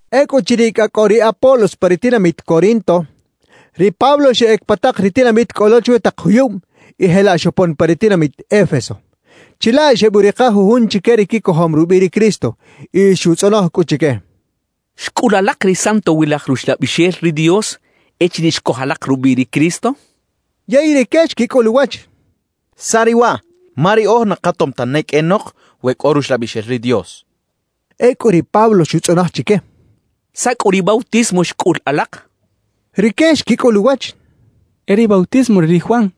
Ecꞌuchiriꞌ cꞌa cꞌo ri Apolos pa ri tinamit Corinto, ri Pablo xeꞌec pa tak ri tinamit cꞌo lo chwi tak juyub y jelaꞌ xopon pa ri tinamit Éfeso. Chilaꞌ xebuꞌrika jujun chique ri quicojom rubiꞌ ri Cristo y xutzꞌonoj cꞌu chique: —¿Xcꞌul alak ri Santowilaj Ruxlabixel ri Dios echiriꞌ xcoj alak rubiꞌ ri Cristo? —xcha chique. Yey rique xquicꞌul uwach: —¿Saꞌ riꞌ waꞌ? Ma riꞌoj na katom tane qꞌuenok we cꞌo Ruxlabixel ri Dios —xechaꞌ. Ecꞌu ri Pablo xutzꞌonoj chique: —¿Saꞌ cꞌu ri bautismo xcꞌul alak? —xchaꞌ. Rique xquicꞌul uwach: —E ri bautismo re ri Juan —xechaꞌ.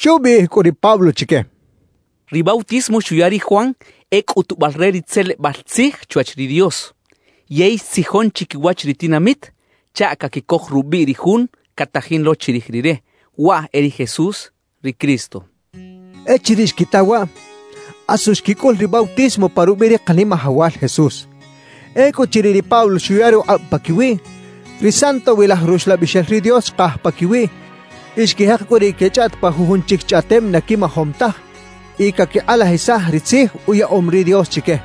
Xubiꞌij cꞌu ri Pablo chique: —Ri bautismo xuya ri Juan e cꞌutubal re ri tzelebal tzij chwach ri Dios, yey xtzijon chiquiwach ri tinamit chaꞌ caquicoj rubiꞌ ri Jun catajin lo chirij rire; waꞌ e ri Jesús, ri Cristo —xchaꞌ. Echiriꞌ xquita waꞌ, asu xquicꞌul ri bautismo pa rubiꞌ ri Kanimajawal Jesús. Ecꞌuchiriꞌ ri Pablo xuya rukꞌab paquiwiꞌ, ri Santowilaj Ruxlabixel ri Dios xkaj paquiwiꞌ y xquijek cꞌu riꞌ quechꞌaꞌt pa jujun chic chꞌaꞌtem na quimajom taj y caquikꞌalajisaj ri tzij uyaꞌom ri Dios chique.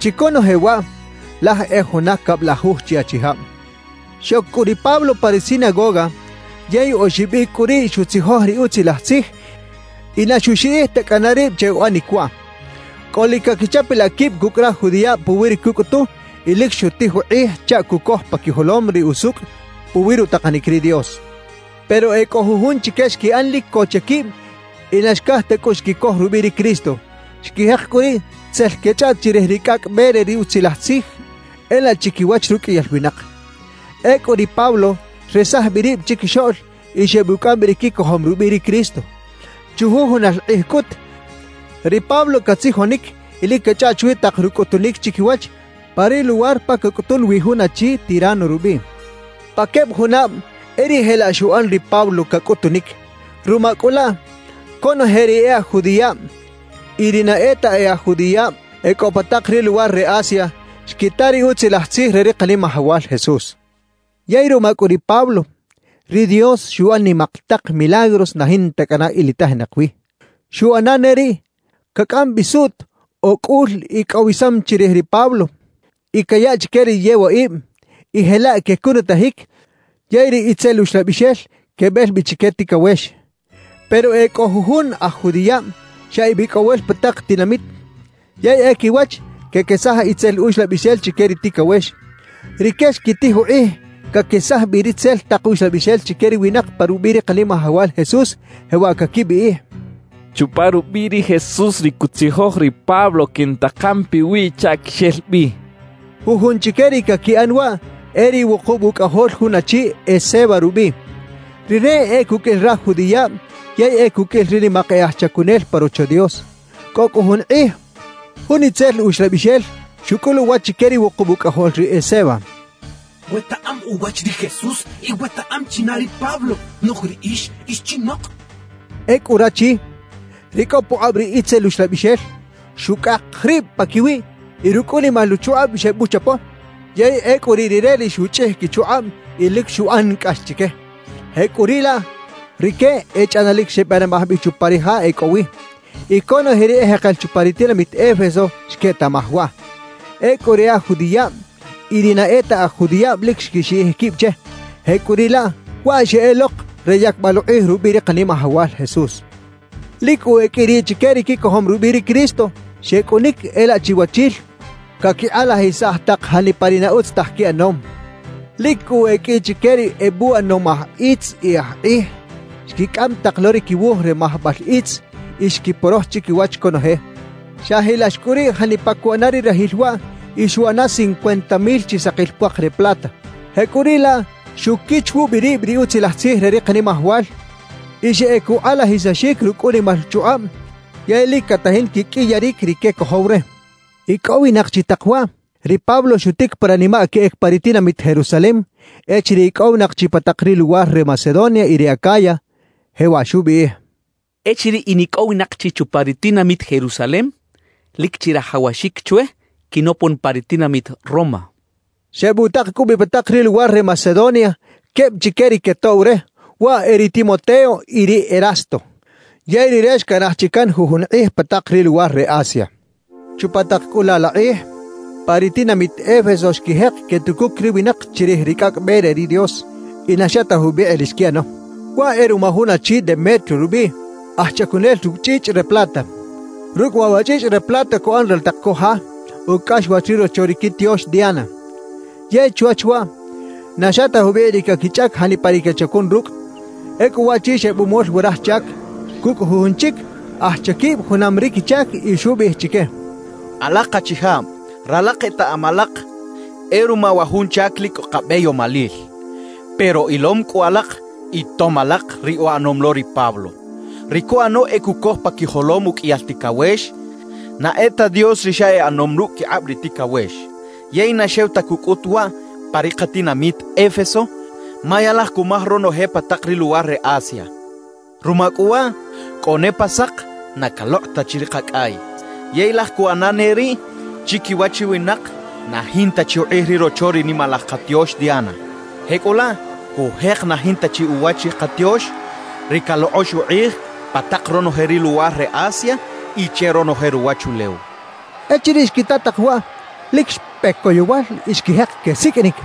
Chi conoje waꞌ laj e juna cablajuj chi achijab. Xoc cꞌu ri Pablo pa ri sinagoga, yey oxib icꞌ cꞌu riꞌ xutzijoj ri Utzilaj Tzij y na xuxiꞌij ta cꞌana rib che uꞌanic waꞌ. Cꞌolic caquichapalaꞌ quib cucꞌ raj judiꞌab puwi ri cucꞌutu y lic xutij ukꞌij chaꞌ cucoj pa quijolom ri usucꞌ puwi rutakanic ri Dios. Pero e cꞌo jujun chique xquiꞌan lic co che quib y na xcaj ta cꞌu xquicoj rubiꞌ ri Cristo; xquijek cꞌu riꞌ tzel quechꞌaꞌt chirij ri Cꞌacꞌ Be re ri Utzilaj Tzij e laꞌ chiquiwach ruqꞌuiyal winak. Ecꞌu ri Pablo xresaj bi rib chiquixoꞌl y xebucꞌam bi ri quicojom rubiꞌ ri Cristo. Chujujunal kꞌij cꞌut, ri Pablo catzijonic y lic cachꞌaꞌt chwi tak rucꞌutunic chiquiwach, pa ri luwar pa cacꞌutun wi jun achi Tirano rubiꞌ. Pa queb junab e riꞌ jelaꞌ xuꞌan ri Pablo, cacꞌutunic. Ruma cꞌu laꞌ, conoje ri e aj judiꞌab y ri na e ta e aj judiꞌab e cꞌo pa tak ri luwar re Asia, xquita ri Utzilaj Tzij re ri Kanimajawal Jesús. Yey ruma cꞌu ri Pablo, ri Dios xuꞌan nimak tak milagros na jinta cꞌana ilitajinak wi. Xuꞌana ne riꞌ, cacꞌam bi suꞌt o cꞌul icꞌowisam chirij ri Pablo y cayaꞌ chique ri yewaꞌib, y jelaꞌ quecunutajic yey ri itzel uxlabixel quebel bi chique ticawex. Pero e cꞌo jujun aj judiꞌab xa ebicꞌowel pa tak tinamit yey e quiwach quequesaj itzel uxlabixel chique ri ticawex. Rique xquitij ukꞌij caquesaj bi ritzel tak uxlabixel chique ri winak pa rubiꞌ ri Kanimajawal Jesús, jewaꞌ caquibiꞌij: «Chupa rubiꞌ ri Jesús ri cutzijoj ri Pablo, quintakan piwiꞌ chaꞌ quixel bi» quechaꞌ. Jujun chique ri caquiꞌan waꞌ e ri wukub ucꞌajol jun achi Esceva rubiꞌ. Rire e cuqꞌuil raj judiꞌab yey e cuqꞌuil ri nimak e aj chacunel pa Rocho Dios. Cꞌo cꞌu jun kꞌij, jun itzel uxlabixel xucꞌul uwach chique ri wukub ucꞌajol ri Esceva: «Wetaꞌam uwach ri Jesús y wetaꞌam china ri Pablo; noꞌj riꞌix, ¿ix chinok?» xchaꞌ. Ecꞌu rachi, ri cꞌo pukꞌab ri itzel uxlabixel, xucꞌak rib paquiwiꞌ y rucꞌ unimal uchukꞌab xebuchapo, yey ecꞌu riꞌ rire ri xuchꞌij quichukꞌab y lic xuꞌan cꞌax chique. Jecꞌuriꞌlaꞌ, rique echꞌanalic xebanimaj bi chupa ri ja e cꞌo wi. Y conoje ri ejekel chupa ri tinamit Éfeso xquetaꞌmaj waꞌ. Ecꞌu ri e aj judiꞌab y ri na e ta aj judiꞌab lic xquixiꞌij quib che; jecꞌuriꞌlaꞌ, waꞌ xeꞌelok re yacbal ukꞌij rubiꞌ ri Kanimajawal Jesús. Lic cꞌu e qꞌui riꞌ chique ri quicojom rubiꞌ ri Cristo, xecꞌunic e laꞌ chiwachil caquikꞌalajisaj tak janipa ri na utz taj quiꞌanom. Lic cꞌu e qꞌui chique ri ebuꞌanom aj itz y aj kꞌij, xquicꞌam tak lo ri quiwuj re majbal itz y xquiporoj chiquiwach conoje. Xajilax cꞌu riꞌ janipa cuꞌana ri rajil waꞌ y xuꞌana cincuenta mil chi sakil puak re plata. Jecꞌuriꞌlaꞌ xuquich wubi rib ri Utzilaj Tzij re ri Kanimajawal y xeꞌec ukꞌalajisaxic rucꞌ unimal chukꞌab; yey lic catajin quiqꞌuiyaric ri quecojow re. Icꞌowinak chi tak waꞌ, ri Pablo xutic pa ranimaꞌ queꞌec pa ri tinamit Jerusalem echiriꞌ icꞌowinak chi pa tak ri luwar re Macedonia y re Acaya. Jewaꞌ xubiꞌij: «Echiriꞌ inicꞌowinak chi chupa ri tinamit Jerusalem, lic chirajawaxic chwe quinopon pa ri tinamit Roma.» Xebutak cꞌu bi pa tak ri luwar re Macedonia queb chique ri quetoꞌw re, waꞌ e ri Timoteo y ri Erasto. Yey rire xcanaj chi can jujun kꞌij pa tak ri luwar re Asia. Chupa tak cꞌu laꞌ la kꞌij, pa ri tinamit Éfeso xquijek quetucuc ri winak chirij ri Cꞌacꞌ Be re ri Dios y na xa ta jubikꞌ ri xquiꞌano. Waꞌ e ruma jun achi Demetrio rubiꞌ, aj chacunel rucꞌ chꞌichꞌ re plata. Rucꞌ waꞌ wa chꞌichꞌ re plata cuꞌan raltak co ja, ucꞌaxwach ri rocho ri quitiox Diana. Yey chwach waꞌ, na xa ta jubikꞌ ri caquichꞌac janipa ri quechacun rucꞌ. Ecꞌu waꞌchi xebumol wa raj chac, cucꞌ jujun chic aj chaquib junam ri quichac y xubiꞌij chique: «Alak achijab, ralak etaꞌam alak e ruma wa jun chac lic cꞌo kabeyomalil. Pero ilom cꞌu alak y tom alak ri uꞌanom lo ri Pablo. Ri cuꞌano e cucoj pa quijolom uqꞌuiyal ticawex na e ta dios ri xa e ꞌanom rucꞌ quikꞌab ri ticawex. Yey na xew ta cucꞌut waꞌ pa ri katinamit Éfeso, ma ya laj cumaj ronoje pa tak ri luwar re Asia. Ruma cꞌu waꞌ, cꞌo ne pa sak na calokꞌ ta chi ri kacꞌay, yey laj cuꞌana ne riꞌ chiquiwach ri winak na jinta chi ukꞌij ri rocho ri nimalaj katiox Diana. Jecꞌulaꞌ, cujek na jinta chi uwach ri katiox, ri calokꞌox ukꞌij pa tak ronoje ri luwar re Asia y che ronoje ruwachulew» xchaꞌ. Echiriꞌ xquita tak waꞌ, lic xpe coyowal y xquijek quesiqꞌuinic: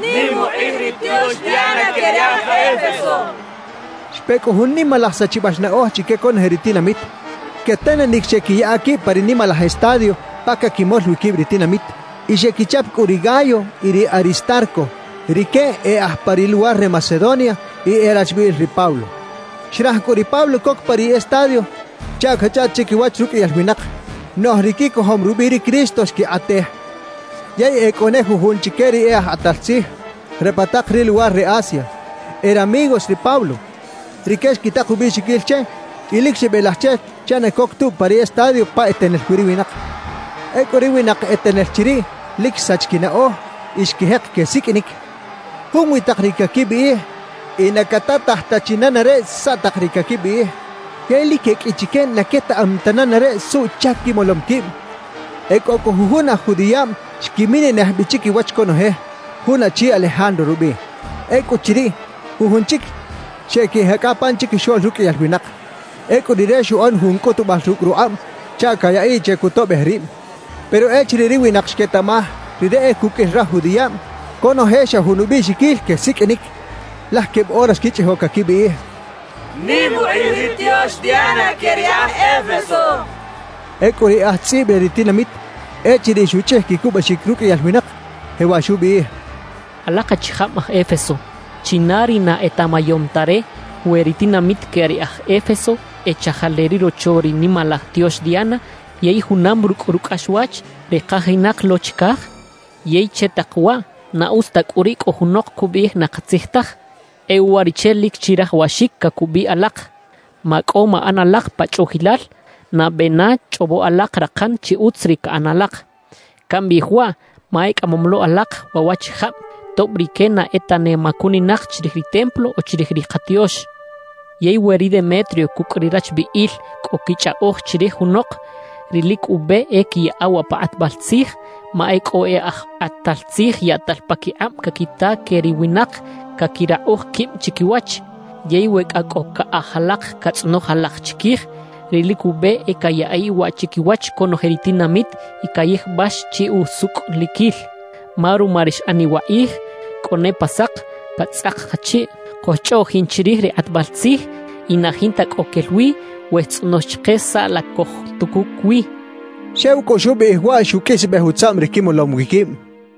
«¡Nim ukꞌij ri tiox Diana que ri aj Éfeso!» quechaꞌ. Xpe cꞌu jun nimalaj sachibal naꞌoj chique conoje ri tinamit. Quetenenic xeꞌquiyaꞌa quib pa ri nimalaj estadio pa caquimol wi quib ri tinamit. Y xequichap cꞌu ri Gayo y ri Aristarco; rique e aj pa ri luwar re Macedonia y e rachbiꞌil ri Pablo. Xraj cꞌu ri Pablo coc pa ri estadio chaꞌ cachꞌaꞌt chiquiwach ruqꞌuiyal winak, noꞌj ri quicojom rubiꞌ ri Cristo xquikꞌatej. Yey e cꞌo ne jujun chique ri e aj kꞌatal tzij re pa tak ri luwar re Asia, e ramigos ri Pablo; rique xquitak ubiꞌxiquil che y lic xebelaj che chaꞌ na coc tubi pa ri estadio pa etenel wi ri winak. Ecꞌu ri winak etenel chiriꞌ lic xsach quinaꞌoj y xquijek quesiqꞌuinic. Junwi tak ri caquibiꞌij y na catataj ta chi nenareꞌ saꞌ tak ri caquibiꞌij. Yey lic e qꞌui chique na quetaꞌam ta nenareꞌ suꞌchac quimolom quib. E cꞌo cꞌu jujun aj judiꞌab xquiminenej bi chiquiwach conoje, jun achi Alejandro rubiꞌ. Ecꞌuchiriꞌ, jujun chic xeꞌquijecꞌa pan chiquixoꞌl ruqꞌuiyal winak. Ecꞌu rire xuꞌan jun cꞌutubal rucꞌ rukꞌab chaꞌ cayaꞌiꞌ che cutoꞌbej rib. Pero echiriꞌ ri winak xquetaꞌmaj rire e cuqꞌuil raj judiꞌab, conoje xa jun ubiꞌxiquil quesiqꞌuinic, laj queb ora xquichꞌijo caquibiꞌij: «¡Nim ukꞌij ri tiox Diana que ri aj Éfeso!» quechaꞌ. Ecꞌu ri aj tzꞌib re ri tinamit, echiriꞌ xuchꞌij quicubaxic ruqꞌuiyal winak, jewaꞌ xubiꞌij: «Alak achijab aj Éfeso, ¿china ri na etaꞌmayom ta re we ri tinamit que ri aj Éfeso e chajal re ri rocho ri nimalaj tiox Diana yey junam rucꞌ rucꞌaxwach, ri kajinak lo chicaj? Yey che tak waꞌ, na utz ta cꞌu riꞌ cꞌo junok cubiꞌij na katzij taj. E uwariꞌche lic chirajawaxic cacubiꞌ alak. Macꞌo maꞌan alak pa chꞌuꞌjilal; nabe na chꞌobo alak rakan chi utz ri caꞌan alak. Cambiꞌij waꞌ, ma ecꞌamom lo alak waꞌ waꞌchijab tob rique na e tane macuninak chirij ri templo o chirij ri katiox. »Yey we ri Demetrio cucꞌ ri rachbiꞌil cꞌo quichꞌaꞌoj chirij junok, ri lic ube e quiyaꞌa waꞌ pa kꞌatbal tzij; ma e cꞌo e aj kꞌatal tzij yaꞌtal paquikꞌab caquita que ri winak caquirakꞌuj quib chiquiwach. Yey we cꞌa cꞌo caꞌaj alak catzꞌonoj alak chiquij, ri lic ube e cayaꞌiꞌ waꞌ chiquiwach conoje ri tinamit y cayijbax chi usucꞌliquil. Ma ruma ri xꞌaniꞌ wakꞌij, cꞌo ne pa sak catzꞌak kachiꞌ cojchꞌoꞌjin chirij ri kꞌatbal tzij y na jinta cꞌo quel wi we xtzꞌonox chike saꞌ la cojtucuc wi» xchaꞌ. Xew cꞌu xubiꞌij waꞌ xuqꞌuisbej utzaꞌm ri quimolom wi quib.